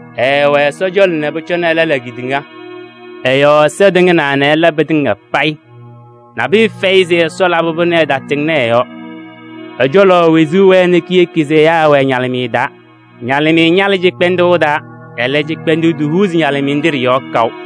Ɛɛwɛ Ɛsɔ cɔlɔ nɛ pʋcɔ ɛlɛ la kedeŋa. Ɛ-yɔɔ Ɛsɔ tɩŋnaa nɛ ɛla pɩtɩŋa payɩ. Nabʋyʋ fɛyɩ se Ɛsɔ labɩ-pʋ nɛ ɛtatɩŋnɩ ɛ-yɔɔ. Ɛ-cɔlɔ wezuu wɛɛ nɛ kiyeki se ɛyaa ɛwɛɛ ñalɩmɩyɛ taa. Ñalɩmɩyɛ ñalɩɣ cɩkpɛndʋʋ taa, ɛlɛ, cɩkpɛndʋʋ tohuuzi ñalɩmɩyɛ nɖɩ ɖɩ-yɔɔ kaʋ.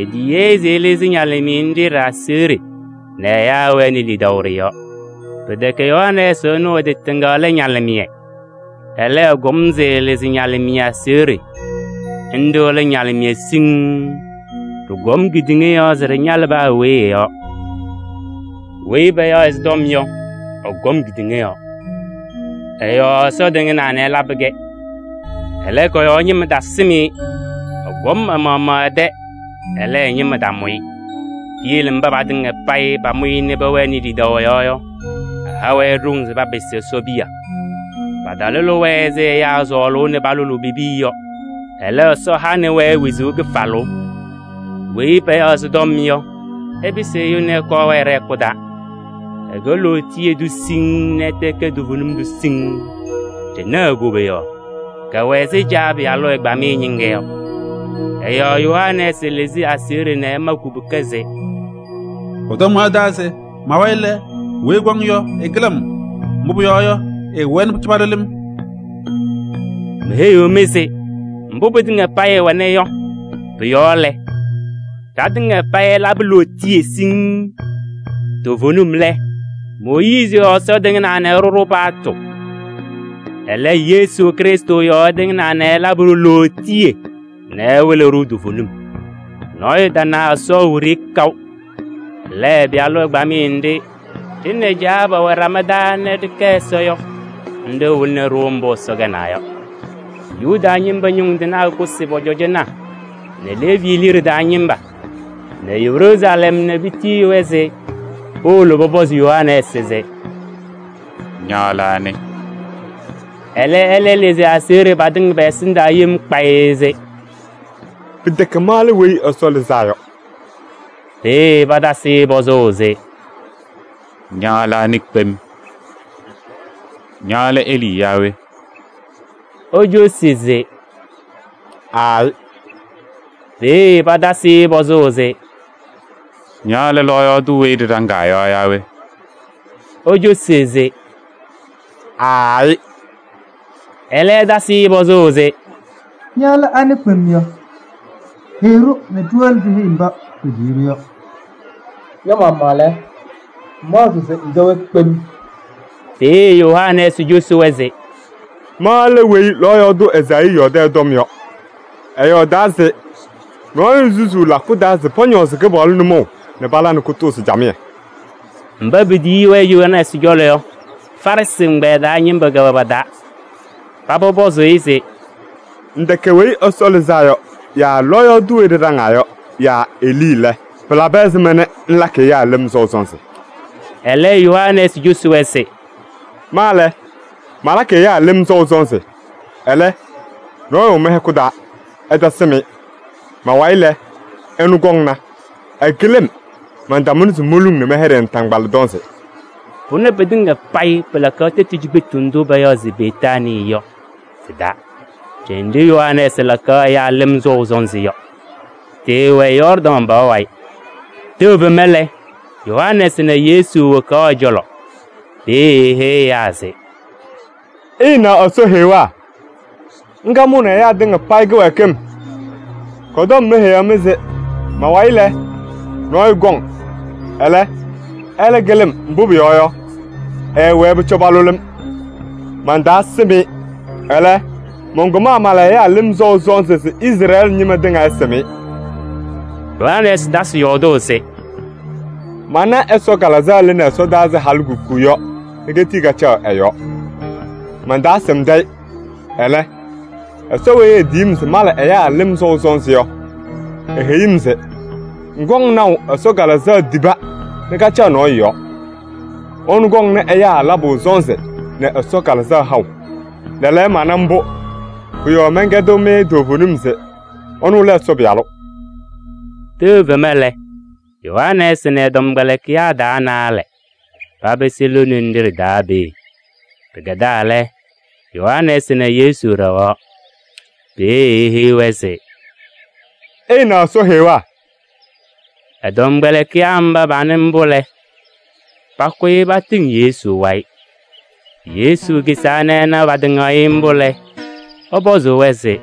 Etiyi-i se ɛlɩzɩ ñalɩmɩyɛ nɖɩ ɖɩ-aseɣɖe nɛ ɛyaa wɛnɩ lidaʋ ɖɩ-yɔɔ. Pɩtɛkɛ Yohanɛɛsɩ ɛnʋ ɛ-tɩ tɩŋa lɛ ñalɩmɩyɛ. Ɛlɛ, ɛkɔm se ɛlɩzɩ ñalɩmɩyɛ aseɣɖe. Nɖɩ lɛ ñalɩmɩyɛ siŋŋ, ɖɩkɔm kedeŋa yɔɔ se ɖɩñalɩ paa weyi ɛ-yɔɔ. Weyi payaɣ se Tɔm yɔ, ɛkɔm kedeŋa yɔɔ. Ɛ-yɔɔ Ɛsɔ tɩŋnaa nɛ ɛlabɩ-kɛ. Ɛlɛ, kɔ-yɔɔ ñɩma tasɩm-ɩ. Ɛkɔm ɛ-maɣmaɣ ɛ-tɛ, ɛlɛ, ɛ-ñɩma tamʋ-ɩ. Piyele mba patɩŋa payɩ pamʋ-ɩ nɛ pɛwɛnɩ lidaʋ ɛ-yɔɔ yɔ, ɛha-wɛ ɖoŋ se papɩsɩ Ɛsɔ piya. Patalʋlɩ-wɛ ɛzɩ ɛyaa sɔɔlʋʋ nɛ palʋlʋʋ pe-piya yɔ. Ɛlɛ, Ɛsɔ hanɩ-wɛ wezuu kɩfalʋʋ. Weyi payaɣ se Tɔm yɔ, ɛpɩsɩ ɛyʋ nɛ ɛkɔɔ ɛwɛɛ ɖɛ-hɛkʋ taa. Ɛkɛ lootiye tʋ siŋŋ nɛ ɛtɛ ɛkɛ toovenim tʋ siŋŋ. Ɖɩna e-koboyaɣ, kɛwɛ ɛzɩ Caa Pɩyalʋ ɛgbamɩyɛ ñɩŋga yɔ. Ɛ-yɔɔ Yohanɛɛsɩ lɩzɩ aseɣɖe nɛ ɛma kubuka se: “Ɛ-tɔm mɔyɔɔdaɣ se: ‘Ma-wayɩ lɛ, weyi ɛkɔŋ yɔ, ɛkɩlɩ-m, mbʋ pʋyɔɔ yɔ, ɛɛwɛɛ nɛ pʋcɔ palʋlɩ-m.’” Meheyiɣ-mɩ se mbʋ pɩtɩŋa payɩ ɛwɛna yɔ, pʋ-yɔɔ lɛ, ɖatɩŋa payɩ ɛlabɩ lootiye siŋŋ. Toovenim lɛ, Mooyiizi yɔɔ Ɛsɔ tɩŋnaa nɛ ɛɖʋ-ɖʋ paɣtʋ. Ɛlɛ, Yesu Krɩstʋ yɔɔ ɛtɩŋnaa nɛ ɛlabɩ-ɖʋ lootiye nɛ ɛwɩlɩ-ɖʋ toovenim. Nɔɔyʋ tana Ɛsɔ wiɖiyi kaʋ. Ɛlɛ, ɛ-Pɩyalʋ ɛgbamɩyɛ nɖɩ ɖɩ nɛ Caa pɛwɛ ɖama taa nɛ ɖɩkɛ Ɛsɔ yɔ, nɖɩ wɩlɩnɩ-ɖʋ mbʋ Ɛsɔ kɛnaa yɔ. Yuda ñɩma ñʋŋ tɩnaa kʋsɩ pɔ-cɔjɔnaa nɛ Leevi liɖe taa ñɩma nɛ Yeruusalɛm nɛ petiyi-wɛ se powolo pɔpɔzɩ Yohanɛɛsɩ se: “Ña lɛ anɩ?” Ɛlɛ, ɛlɩzɩ aseɣɖe patɩŋa pɛ-ɛsɩndaa yem kpayɩ se: “Pɩtɛkɛ ma lɛ Weyi Ɛsɔ Lɩzaa Yɔ.” Peeye patasɩ-ɩ pɔzʋʋ se: “Ña lɛ anɩ kpem? Ña lɛ Elii yaa we?” Ecosi se: “Aayɩ.” Peeye patasɩ-ɩ pɔzʋʋ se: “Ña lɛ lɔɔyaɣ tʋ weyi ɖɩɖaŋaa yɔ yaa we?” Ecosi se: “Aayɩ.” Ɛlɛ patasɩ-ɩ pɔzʋʋ se: “Ña lɛ anɩ kpem yɔ? Heyi-ɖʋ nɛ ɖiwolo ɖiheyi mba petiyi-ɖʋ yɔ. Ña-maɣmaɣ lɛ, ŋmaɣzɩɣ se ŋkɛ we kpem?” Peeye Yohanɛɛsɩ cosi-wɛ se ma lɛ weyi lɔɔyaɣ tʋ Ezaayii yɔɔdɩ ɛ-tɔm yɔ. Ɛyɔɔdaa se: “Nɔɔyʋ susuu lakʋ taa se pɔñɔɔzɩ Kɩpaɣlʋ nʋmɔʋ nɛ pala nɛ kʋtʋʋzɩ camɩyɛ.” Mba petiyi-wɛ Yohanɛɛsɩ cɔlɔ yɔ, Farɩsɩ ɛgbɛyɛ taa ñɩma kɛwɛ pa-taa. Paba pɔzɩnɩ-ɩ se: “Ŋtɛkɛ Weyi Ɛsɔ Lɩzaa Yɔ yaa lɔɔyaɣ tʋ weyi ɖɩɖaŋaa yɔ yaa Elii lɛ, pɩlabɩ ɛzɩma nɛ ŋlakɩ ɛyaa lɩm sɔʋ sɔnzɩ?” Ɛlɛ Yohanɛɛsɩ cosi-wɛ se: “Ma lɛ, malakɩ ɛyaa lɩm sɔʋ sɔnzɩ. Ɛlɛ, nɔɔyʋ wɛ mɩ-hɛkʋ taa, ɩtasɩm-ɩ. Ma-wayɩ lɛ, ɛnʋ kɔŋna. Ɛkɩlɩ-m, mantamʋnɩ se moluŋ nɛ mɛyɛɖɩ ɛ-naataŋgbala tɔnzɩ.” Pʋnɛ pɩtɩŋa payɩ pɩlakaɣ tɛtʋ cikpetu ndʋ payaɣ se Betaanii yɔ, tɩ-taa ɖenɖe Yohanɛɛsɩ lakaɣ ɛyaa lɩm sɔʋ sɔnzɩ yɔ. Tɩɩwɛ Yɔɔrdaŋ pɔɔ wayɩ. Tɛʋ fema lɛ, Yohanɛɛsɩ na Yesu wokaɣ ɛ-cɔlɔ. Peeye eheyi ɛyaa se: “Ɩnaɣ Ɛsɔ Heɣa, ŋga mʋʋnɩ ɛyaa tɩŋa payɩ kɩwɛɛkɩm. Kɔ-tɔm mɔyɔɔdaɣ se ma-wayɩ lɛ, nɔɔyʋ kɔŋ. Ɛlɛ, ɛkɩlɩ-m, mbʋ pʋyɔɔ yɔ, ɛɛwɛɛ nɛ pʋcɔ palʋlɩ-m. Mantaasɩm-ɩ. Ɛlɛ, mɔnkɔm mala ɛyaa lɩm sɔʋ sɔnzɩ se Izrɛɛlɩ ñɩma tɩŋa ɛsɩm-ɩ.” Yohanɛɛsɩ tasɩ yɔɔdʋʋ se: “Mana Ɛsɔ Kalɩzaɣ lɩnɩ ɛsɔdaa ɛzɩ halikuku yɔ nɛ ketii kacaɣ ɛ-yɔɔ. Mantaasɩmdɩ-ɩ. Ɛlɛ, Ɛsɔ weyi etiyi-m se mala ɛyaa lɩm sɔʋ sɔnzɩ yɔ, eheyi-m se: ‘Ŋkɔŋ naʋ Ɛsɔ Kalɩzaɣ tiba nɛ kacaɣ nɔɔyʋ yɔɔ. Ɛnʋ kɔŋnɩ ɛyaa labʋ sɔnzɩ nɛ Ɛsɔ Kalɩzaɣ haʋ.’ Lɛɛlɛɛyɔ mana mbʋ, pʋ-yɔɔ mankaɖɩɣ-mɩ toovenim se ɛnʋ lɛ Ɛsɔ Pɩyalʋ.” Tɛʋ fema lɛ, Yohanɛɛsɩ nɛ ɛ-tɔmkpɛlɩkɩyaa taa naalɛ papɩsɩ lone nɖɩ ɖɩ-taa peeye. Pɩkɛdaa lɛ, Yohanɛɛsɩ na Yesu ɖɛɣaɣ. Peeye eheyi-wɛ se: “Ɩna Ɛsɔ Heɣa.” Ɛ-tɔmkpɛlɩkɩyaa mba panɩ mbʋ lɛ, pakʋyɩ patɩŋ Yesu wayɩ. Yesu kisaa nɛ ɛna patɩŋaɣ-ɩ mbʋ lɛ, ɛpɔzɩ-wɛ se: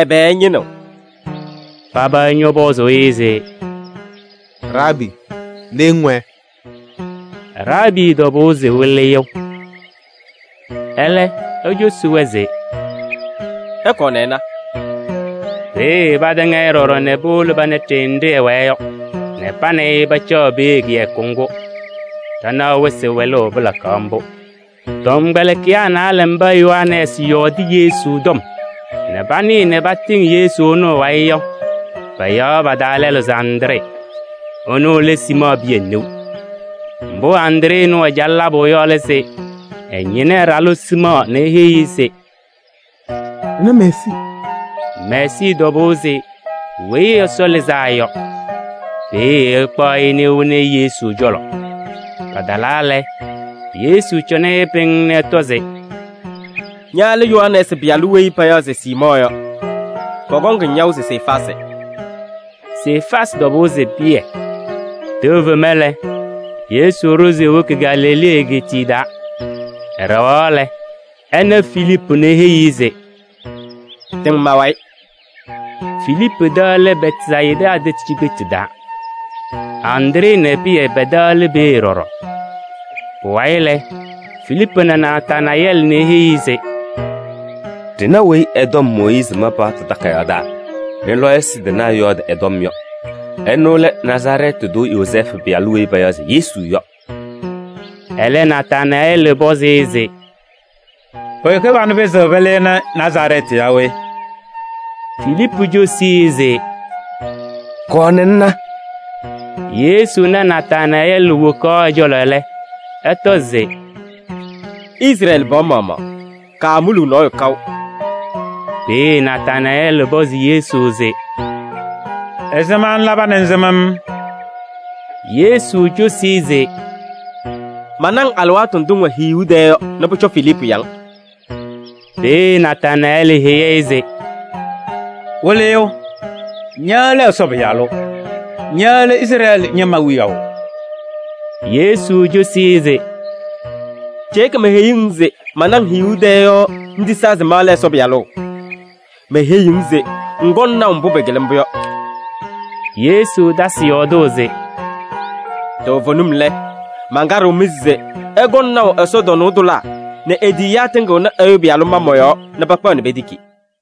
“Ɛbɛ ɩñɩnɩɣ?” Paba ñɔpɔzɩ-ɩ se: “Raabii! Le ŋwɛɛ?” Raabii tɔbʋʋ se Wɩlɩyʋ. Ɛlɛ ecosi-wɛ se: “Ɩkɔɔ nɛ ɩna.” Peeye patɩŋ-ɩ ɖɔɖɔ nɛ powolo pana ɖenɖe ɛwɛɛ yɔ nɛ pa nɛ ɩ pacaɣ peeye kɩyakʋ ŋgʋ. Ɖanaɣ wɩsɩ wɛlʋʋ pɩlakaɣ mbʋ. Tɔmkpɛlɩkɩyaa naalɛ mba Yohanɛɛsɩ yɔɔdɩ Yesu tɔm nɛ panɩɩ nɛ patɩŋ Yesu ɛnʋ ɛ-wayɩ yɔ, payaɣ pa-taa lɛlʋ se Andree. Ɛnʋ lɛ Siimɔɔ Pɩyɛ neu. Mbʋ Andree ɛnʋ ɛcalɩ labʋ yɔ lɛ se: ɛñɩnɩ ɛ-ɖalʋ Siimɔɔ nɛ eheyi-i se: “Ɖɩna Meesii.” Meesii tɔbʋʋ se Weyi Ɛsɔ Lɩzaa Yɔ. Peeye ɛkpaɣ-ɩ nɛ ewoni-i Yesu cɔlɔ. Patalaa lɛ, Yesu cɔnɩ-ɩ pɩŋŋ nɛ ɛtɔ se: “Ña lɛ Yohanɛɛsɩ pɩyalʋ weyi payaɣ se Siimɔɔ yɔ, pɔkɔŋ-ŋ yaʋ se Sefaasɩ.” Sefaasɩ tɔbʋʋ se Pɩyɛ. Tɛʋ fema lɛ, Yesu ɖʋ se ewoki Galilee egeetiye taa. Ɛɖɛɣaɣ lɛ, ɛna Filiipu nɛ eheyi-i se: “Tɩŋ ma-wayɩ.” Filiipu tɛ lɛ Bɛtsayɩda tɛtʋ cikpetu taa. Andree nɛ Pɩyɛ pɛ-tɛ lɛ peeye ɖɔɖɔ. Pʋwayɩ lɛ, Filiipu na Nataanayɛɛlɩ nɛ eheyi-i se: “Ɖɩna weyi ɛ-tɔm Mooyiizi ma paɣtʋ takayaɣ taa nɛ lɔɔyɩsɩ tɩnaa yɔɔdɩ ɛ-tɔm yɔ. Ɛnʋ lɛ Nazarɛɛtɩ tʋ Yozɛɛfʋ pɩyalʋ weyi payaɣ se Yesu yɔ.” Ɛlɛ, Nataanayɛɛlɩ pɔzɩ-ɩ se: “Pʋyʋ kɩbanʋ pɩzɩɣ pɩlɩnɩ Nazarɛɛtɩ yaa we?” Filiipu cosi-i se: “Kɔɔ nɛ ŋna.” Yesu na Nataanayɛɛlɩ wokaɣ ɛ-cɔlɔ lɛ, ɛtɔ se: “Ɩna Izrɛɛlɩ pɩɣa maɣmaɣ. Kaamuluu nɔɔyʋ kaʋ.” Peeye Nataanayɛɛlɩ pɔzɩ Yesu se: “Ɛzɩma ŋlaba nɛ ŋsɩm-m?” Yesu cosi-i se: “Mana-ŋ alɩwaatʋ ndʋ ŋwɛ hiyuu tɛɛ yɔ nɛ pʋcɔ Filiipu ya-ŋ.” Peeye Nataanayɛɛlɩ heyi-i se: “Wɩlɩyʋ! Ña lɛ Ɛsɔ Pɩyalʋ. Ña lɛ Izrɛɛlɩ ñɩma wiyaʋ.” Yesu cosi-i se: “Ceeke meheyuu-ŋ se mana-ŋ hiyuu tɛɛ yɔ ŋtisaa se ma lɛ Ɛsɔ Pɩyalʋ? Meheyiɣ-ŋ se ŋkɔŋ naʋ mbʋ pɩkɩlɩ mbʋ yɔ.” Yesu tasɩ yɔɔdʋʋ se: “Toovenim lɛ, mankaɖɩɣ-mɩ se ɩkɔŋ naʋ ɛsɔtɔnʋʋ tʋlaa nɛ e-tiyiyaa tɩŋɩɣnɩ Ɛyʋ Pɩyalʋ ma mɔ-yɔɔ nɛ pakpaɣ nɛ petiki.”